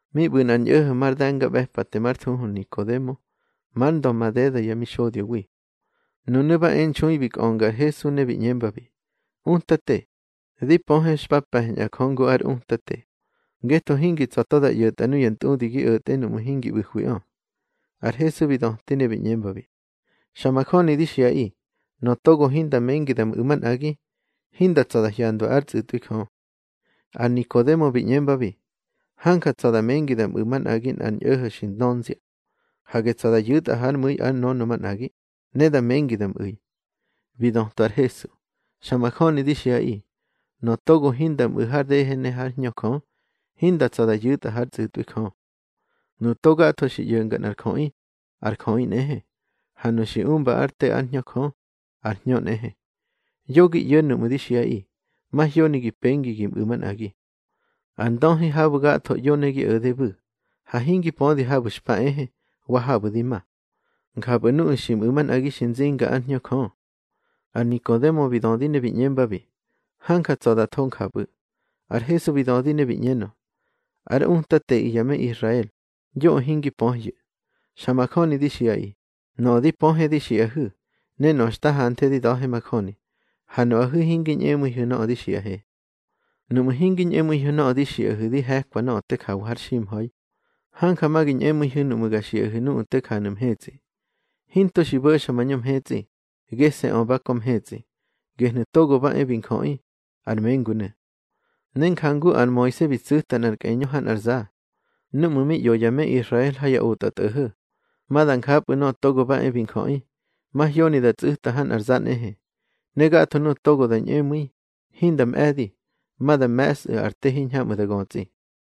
Mi ꞌbu̱ nꞌar ñꞌo̱ho̱ mar de̱ngaꞌbe̱pate már thuhu Nikodemo, mar ndö madeda yá mixodyowi. Nunu̱ ba e nxui bi kꞌönga ar Hesu ne bi ꞌñembabi: —Utate, di pöhe xpa pe̱ñꞌa Jö ngu ár utate, ngetho hingi tsa̱ to da ꞌyo̱tꞌa nuya ntꞌudi gi o̱tge nuꞌmu̱ hingi ꞌbu̱hwiꞌö. Ar Hesu bi döti ne bi ꞌñembabi: —Xa majöni di xiꞌaꞌi, nöꞌö togo hinda mengi da mꞌu̱ manꞌagi, hinda tsa̱ da hyandwa ár tsꞌu̱tꞌwi Jö. Ar Nikodemo bi ꞌñembabi: —Hanja tsa̱ da mengi da mꞌu̱ manꞌagi nꞌar ñꞌo̱ho̱ xi ndönzia. Hage tsa̱ da yu̱tꞌa hár mu̱i ár nönö manꞌagi, ne da mengi da mꞌu̱i. Bi dötwa ar Hesu: —Xa majöni di xiꞌaꞌi, nöꞌö togo hinda mꞌu̱ har dehe ne hár Hñö Jö, hinda tsa̱ da yu̱tꞌa hár tsꞌu̱tꞌwi Jö. Nuꞌu̱ to gatho xi ꞌyo̱nga nꞌar jöꞌi, ar jöꞌi nꞌehe. Ha nuꞌu̱ xi umba ár te ár Hñö Jö, ar hñö nꞌehe. Yo gi ꞌyo̱ nuꞌmu̱ di xiꞌaꞌi, mahyoni gi pengi gi mꞌu̱ manꞌagi. Ar ndöhi habu̱ gatho ꞌyo ne gi o̱de bu̱, ha hingi pödi habu̱ xpa ehe, wa habu̱ di ma. Njapꞌu̱ nuꞌu̱ xi mꞌu̱ manꞌagi xi nzinga ár Hñö Jö. Ar Nikodemo bi dödi ne bi ꞌñembabi: —Hanja tsa̱ da tho njapꞌu̱. Ar Hesu bi dödi ne bi ꞌñenö: —Ár utateꞌi ya me Israel, yoꞌö hingi pöhyu̱. Xa majöni di xiꞌaꞌi, nöꞌö di pöhe di xiꞌahu̱, ne nöꞌö xta hanthe di da̱he majöni, ha nuꞌahu̱ hingi ñꞌemu̱ihu̱ nöꞌö di xiꞌahe. Nuꞌmu̱ hingi ñꞌemu̱ihu̱ nöꞌö di xiꞌahu̱ di he̱kwa nöꞌö te jawa har ximha̱i, hanja ma gi ñꞌemu̱ihu̱ nuꞌmu̱ ga xiꞌahu̱ nuꞌu̱ te janu̱ mhetsꞌi. Hinto xi bo̱xa mañö mhetsꞌi, gese̱ꞌö ba kö mhetsꞌi, gehnu̱ Togo ba e bi Njöꞌi, ar mengunu̱. Ne njangu ar Moise bi tsu̱ta nꞌar kꞌeñö ha nꞌar za, núꞌmu̱ mi ꞌyo ya me Israel ha ya otꞌatꞌo̱ho̱, ma da njapꞌu̱ Nöꞌö Togo ba e bi Njöꞌi, mahyoni da tsꞌu̱ta ha nꞌar za nꞌehe. Ne gatho nuꞌu̱ togo da ñꞌemu̱i, hinda mꞌe̱di, ma da me̱sꞌu̱ ar te hiñhamꞌu̱ da götsꞌi.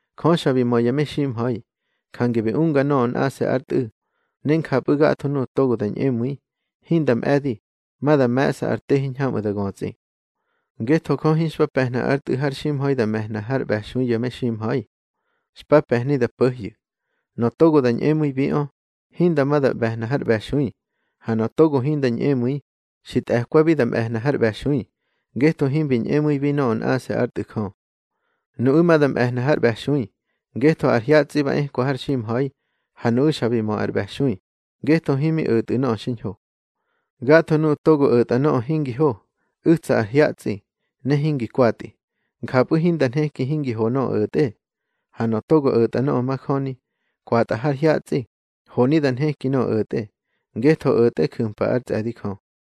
Jö xa bi mö ya meximha̱i, jange bi unga nöꞌö nꞌase̱ ár Tꞌu̱, ne njapꞌu̱ gatho nuꞌu̱ togo da ñꞌemu̱i, hinda mꞌe̱di, ma da me̱ꞌsa ar te hiñhamꞌu̱ da götsꞌi. Ngetho Jö hinxpa pe̱hna ár Tꞌu̱ har ximha̱i da me̱hna har ꞌbe̱xui ya meximha̱i. Xpa pe̱hni da po̱hyu̱. Nöꞌö togo da ñꞌemu̱ibiꞌö, hinda ma da ꞌbe̱hna har ꞌbe̱xui. Ha nöꞌö togo hinda ñꞌemu̱i, xi tꞌe̱kwabi da ꞌbe̱hna har ꞌbe̱xui, ngetho himbi ñꞌemu̱ibi nöꞌö nꞌase̱ ár Tꞌu̱ Jö. Nuꞌu̱ ma da mꞌe̱hna har ꞌbe̱xui, ngetho ar hyatsꞌi ba ekwa har ximha̱i, ha nuꞌu̱ xa bi mö ar ꞌbe̱xui, ngetho himi o̱tꞌu̱ nöꞌö xiñho. Gatho nuꞌu̱ togo o̱tꞌa nöꞌö hingi ho, u̱tsa ar hyatsꞌi, ne hingi kwatꞌi, njapꞌu̱ hinda nheki hingi ho nöꞌö o̱tꞌe. Ha nöꞌö togo o̱tꞌa nöꞌö majöni, kwatꞌa har hyatsꞌi, honi da nheki nöꞌö o̱tꞌe, ngetho o̱tꞌe ju̱mpa ár tsꞌe̱di Jö.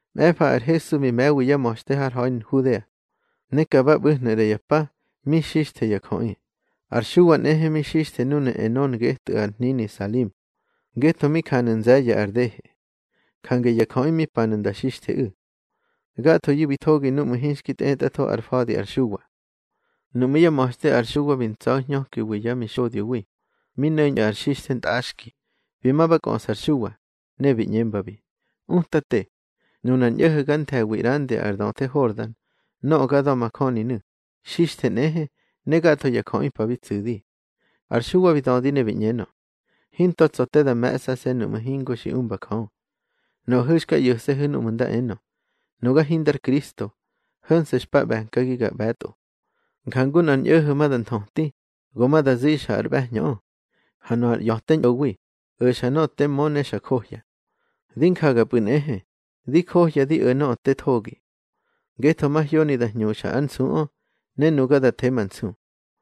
Mꞌe̱fa ar Hesu bi me̱wi yá ma̱xte har ha̱i Nhudea, ne ka ba ꞌbu̱hnu̱ ꞌra ya pa, mi xixthe ya jöꞌi. Ar Xuwa nꞌehe mi xixthe núnu̱ Enon getꞌu̱ ar hnini Salim, ngetho mi janu̱ nze̱ye̱ ar dehe. Jange ya jöꞌi mi panu̱ nda nxixtheꞌu̱. Gathoyu̱ bi thogi núꞌmu̱ hinxki tꞌetꞌatho ar fa̱di ar Xuwa. Nuꞌmú̱ yá ma̱xte ar Xuwa bi ntsa̱hñökiwi yá mixodyowi, mi no̱ñꞌu̱ ar xixthe ntꞌaxki. Bi ma ba kꞌöꞌsa ar Xuwa, ne bi ꞌñembabi: —Utate, nunar ñꞌo̱ho̱ ga nthe̱wi ꞌrandi ar döthe Hordan, nöꞌö ga da̱majöninu̱, xixthe nꞌehe, ne gatho ya jöꞌi pa bi tsu̱di. Ar Xuwa bi dödi ne bi ꞌñenö: —Hinto tsa̱ te da me̱ꞌsase̱ nuꞌmu̱ hingo xi umba Jö. Nuꞌahu̱ xka ꞌyo̱se̱hu̱ núꞌmu̱ nda enö: Nuga hindar Kristo. Ho̱nse̱ xpa ꞌbe̱nkagi ga ꞌbe̱tꞌo. Njangu nꞌar ñꞌo̱ho̱ ma da nthöti, go ma da zixa ar ꞌbe̱hñöꞌö, ha nöꞌö ar ꞌya̱te ñꞌowi, o̱xa nöꞌö te mö ne xa johya. Di njagapꞌu̱ nꞌehe, di johya di o̱ nöꞌö te thogi. Ngetho mahyoni da hñuxa ár nsuꞌö, ne nuga da the ma nsu.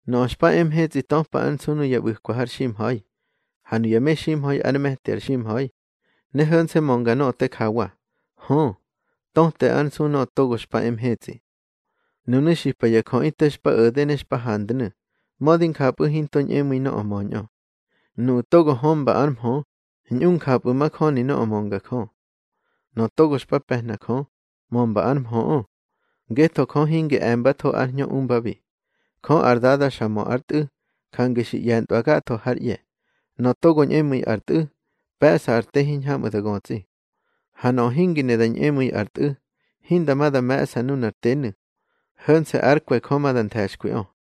Nöꞌö xpa e mhetsꞌi töpa ár nsu nuya ꞌbu̱kwa har ximha̱i. Ha nuya meximha̱i ár me̱ti ar ximha̱i, ne ho̱nse̱ mönga nöꞌö te jawa. Hö, töte ár nsu nöꞌö togo xpa e mhetsꞌi. Nunu̱ xipa ya jöꞌi te xpa o̱de ne xpa handnu̱, mödi njapꞌu̱ hinto ñꞌemu̱i nöꞌö möñꞌö. Nuꞌu̱ togo hömba ár mhö, ñꞌu njapꞌu̱ majöni nöꞌö mönga Jö. Nöꞌö togo xpa pe̱hna Jö, mömba ár mhöꞌö, ngetho Jö hingi e̱mbatho ár Hñö umbabi. Jö ar Dada xa mö ár Tꞌu̱, jange xi ꞌye̱ntꞌwa gatho hár ꞌye̱. Nöꞌö togo ñꞌemu̱i ar Tꞌu̱, pe̱ꞌsa ar te hiñhamꞌu̱ da götsꞌi. Ha nöꞌö hingi ne da ñꞌemu̱i ar Tꞌu̱, hinda ma da me̱ꞌsa nunar tenu̱, ho̱nse̱ ár kwe̱ Jö ma da nthe̱xkwiꞌö.